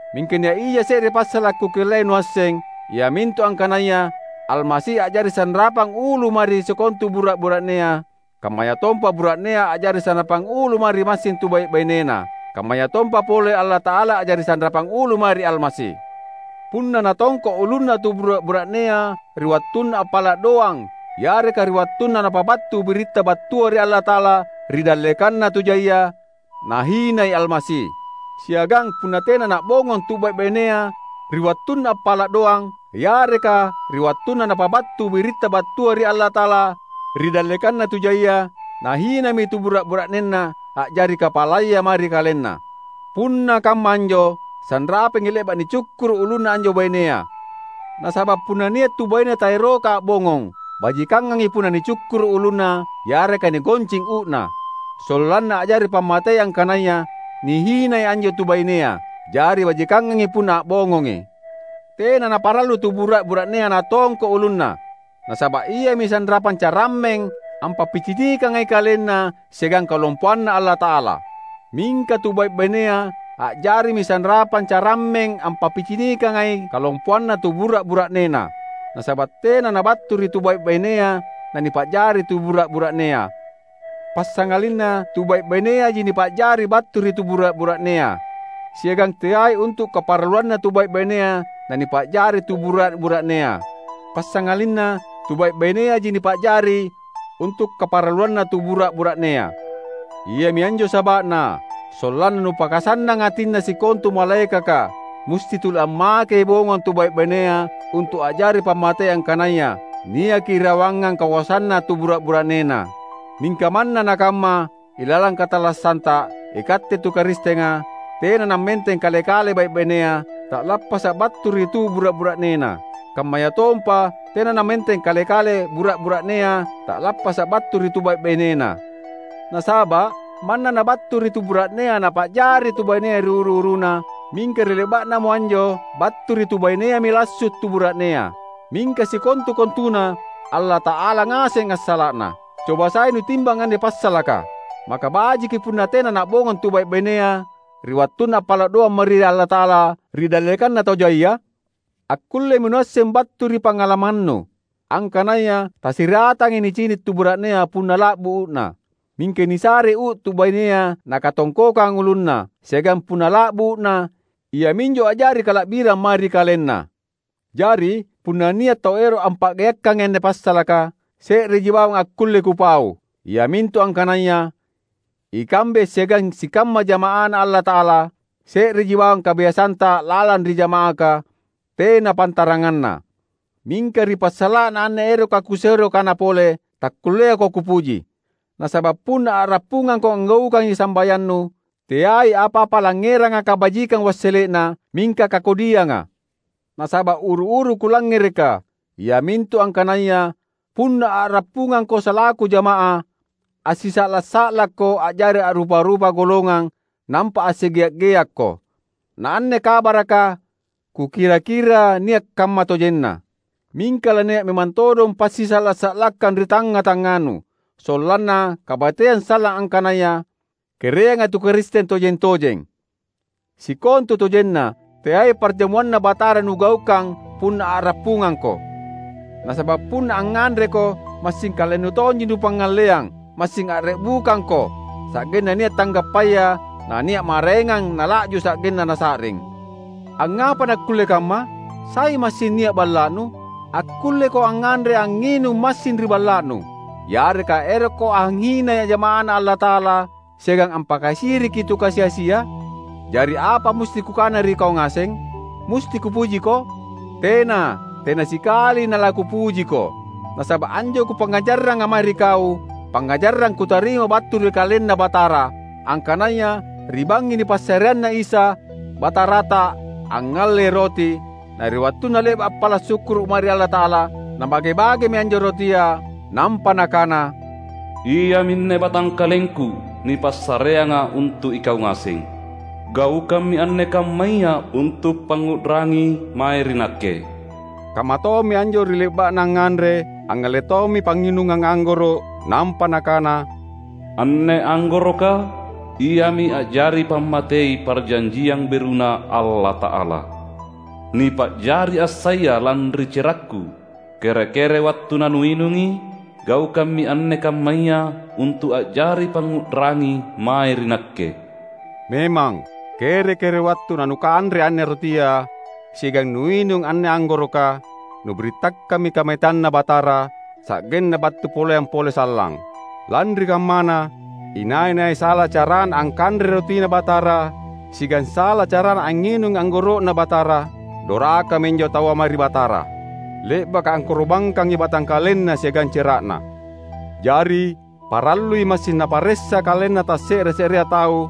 Mingka nia’ ija se’re passala’ kukellai nuasseng, iamintu angkanaya Almasi a’jari sanrapang ulu mae ri sikontu bura’-bura’nea; kammayatompa bura’nea a’jari sanrapang ulu mae ri massing tu bai’-bainena, kammayatompa pole Allata’ala a’jari sanrapang ulu mae ri Almasi. Punna natongko’ ulunna tu bura’-bura’nea ri wattunna appala’ doang yareka ri wattunna napabattu biritta battua ri Allata’ala ri dallekanna tu jaia, nahinai Almasi. Siagang punna tena na’bongong tu bai’-bainea ri wattunna appala’ doang yareka ri wattunna napabattu biritta battua ri Allata’ala ri dallekanna tu jaia, nahinami tu bura’-bura’nena a’jari kapalaya mae ri kalenna. Punna kamma anjo, sanrapangi le’baka nicukkuru’ ulunna anjo bainea. Nasaba’ punna nia’ tu baine taeroka a’bongong, bajikangangi punna nicukkuru’ ulunna yareka nigoncing uu’na, sollanna a’jari pammatei angkanaya nihinai anjo tu bainea. Jari bajikangangi punna a’bongongi. Tena naparallu tu bura’-bura’nea natongko’ ulunna, nasaba’ iami sanrapang carammeng ampappicinikangai KalenNa siagang kalompoanNa Allata’ala. Mingka tu bai’-bainea a’jarimi sanrapang carammeng ampappicinikangai kalompoanna tu bura’-bura’nena, nasaba’ tena nabattu ri tu bai’-bainea nanipa’jari tu bura’-bura’nea, passangalinna tu bai’-baineaji nipa’jari battu ri tu bura’-bura’nea. Siagang teai untu’ kaparalluanna tu bai’-bainea nanipa’jari tu bura’-bura’nea, passangalinna tu bai’-baineaji nipa’jari untu’ kaparalluanna tu bura’-bura’nea. Iami anjo saba’na, sollanna napakasannang atinna sikontu malaekaka musti tuli ammakei bongong tu bai’-bainea untu’ a’jari pammatei angkanaya niaki irawangang kakoasanna tu bura’-bura’nena. Mingka manna nakamma ilalang katallassanta, ikatte tu Karistenga, tena nammenteng kale-kale bai’-bainea, ta’lappasa’ battu ri tu bura’-bura’nena; kammayatompa tena nammenteng kale-kale bura’-bura’nea, ta’lappasa’ battu ri tu bai’-bainena. Nasaba’ manna nabattu ri tu bura’nea nipa’jari tu bainea ri uru-uruna, mingka ri le’ba’namo anjo battu ri tu baineami lassu’ tu bura’nea; mingka sikontu-kontuna Allata’ala ngaseng assala’na. Coba sai nutimbang anne passalaka: Maka bajiki punna tena na’bongong tu bai’-bainea ri wattunna appala’ doang mae ri Allata’ala ri dallekanna tau jaia? Akkullemi nuasseng battu ri pangalamannu, angkanaya tasiratangai nicini’ tu bura’nea punna la’bu uu’na. Mingka nisarei uu’ tu bainea nakatongkokang ulunna, siagang punna la’bu uu’na iaminjo a’jari kala’birang mae ri kalenna. Jari, punna nia’ tau ero’ ampa’geakkangi anne passalaka, se’reji bawang akkulle kupau; iamintu angkanaya, ikambe siagang sikamma jama’aNa Allata’ala, se’reji bawang kabiasanta lalang ri jama’aka, tena pantaranganna. Mingka ri passala’na anne eroka kusero kana pole, takkulleako kupuji. Nasaba’ punna a’rappungangko anggaukangi sambayannu teai apa-apa langngeranga kabajikang wassele’na, mingka kakodianga. Nasaba’ uru-uru kulangngereka iamintu angkanaya punna a’rappungangko salaku jamaah, assisa’la’-sa’lakko a’jari a’rupa-rupa golongang nampa assigea’-geakko. Na anne kabaraka kukira-kira nia’ kamma tojenna. Mingka lania’ memang todong passisa’la’-sa’lakkang ri tangnga-tangnganu, sollanna kabateang sallang angkanaya kereanga tu Karisteng tojeng-tojeng. Sikontutojenna teai ParjamuanNa Batara nugaukang punna a’rappungangko. Nasaba’ punna angnganreko, massing kalennu tonji nupangngalleang; massing a’re’bukangko, sa’genna nia’ tanggappaya nania’ maraengang nala’ju sa’genna nasa’ring. Angngapa nakkulle kamma? Sai massing nia’ balla’nu? Akkulleko angnganre angnginung massing ri balla’nu. Yareka erokko anghinai jama’aNa Allata’ala siagang ampakasiriki tu kasi-asia? Jari apa musti kukana ri kau ngaseng? Musti kupujiko? Tena! Tena sikali nalakupujiko! Nasaba’ anjo kupangngajarranga mae ri kau, pangngajarang kutarima battu ri KalenNa Batara: angkanaya ri bangngi nipassareanna Isa, Batarata, angngallei roti; na ri wattunna le’ba’ appala’ sukkuru’ mae ri Allata’ala, Nabage-bagemi anjo rotia, nampa Nakana, "Iaminne batangkalengKu nipassareanga untu’ ikau ngaseng. Gaukammi anne kammaya untu’ pangngu’rangi mae ri Nakke." Kammatommi anjo ri le’ba’na angnganre, angngalle tommi pangnginungang anggoro’, nampa Nakana, "Anne anggoroka, iami a’jari pammatei Parjanjiang BeruNa Allata’ala, nipa’jari assaya lanri cerakKu. Kere-kere wattu nanuinungi, gaukammi anne kammaya untu’ a’jari pangngu’rangi mae ri Nakke." Memang, kere-kere wattu nanukanre anne rotia siagang nuinung anne anggoroka, nubirittakammi kamateanNa Batara, sa’genna battu poleang pole sallang. Lanri kammana, inai-nai sala carana angkanrei rotiNa Batara siagang sala carana angnginungi anggoro’Na Batara, dorakami anjo taua mae ri Batara, le’baka angkoro’bangkangi batangkalenNa siagang cera’Na. Jari, parallui massing naparessa kalenna tasse’re-se’rea tau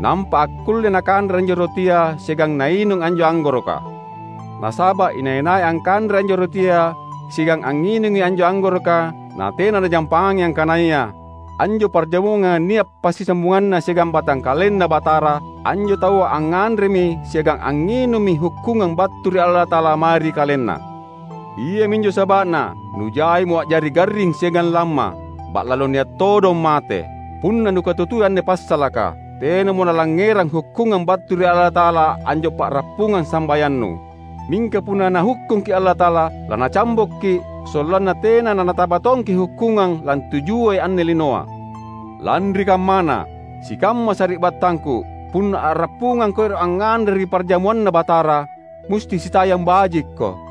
nampa akkulle nakanre anjo rotia siagang nainung anjo anggoroka. Nasaba’ inai-nai angkanrei anjo rotia siagang angnginungi anjo anggoroka natena najampangi angkanaya anjo parjamuanga nia’ passisambunganna siagang batangkalenNa Batara, anjo taua angnganremi siagang angnginummi hukkungang battu ri Allata’ala mae ri kalenna. Iaminjo saba’na nujaimo a’jari garring siagang lamma, ba’lalo nia’ todong mate. Punna nukatutui anne passalaka, tenamo nalangngerang hukkungang battu ri Allata’ala anjo pa’rappungang sambayannu. Mingka punna Nahukkungki’ Allata’ala, laNacambokki’, sollanna tena nanataba tongki’ hukkungang lantujuai anne linoa. Lanri kammana, sikamma sari’battangku, punna a’rappungangko ero’ angnganre ri parjamuanNa Batara, musti sitayang bajikko.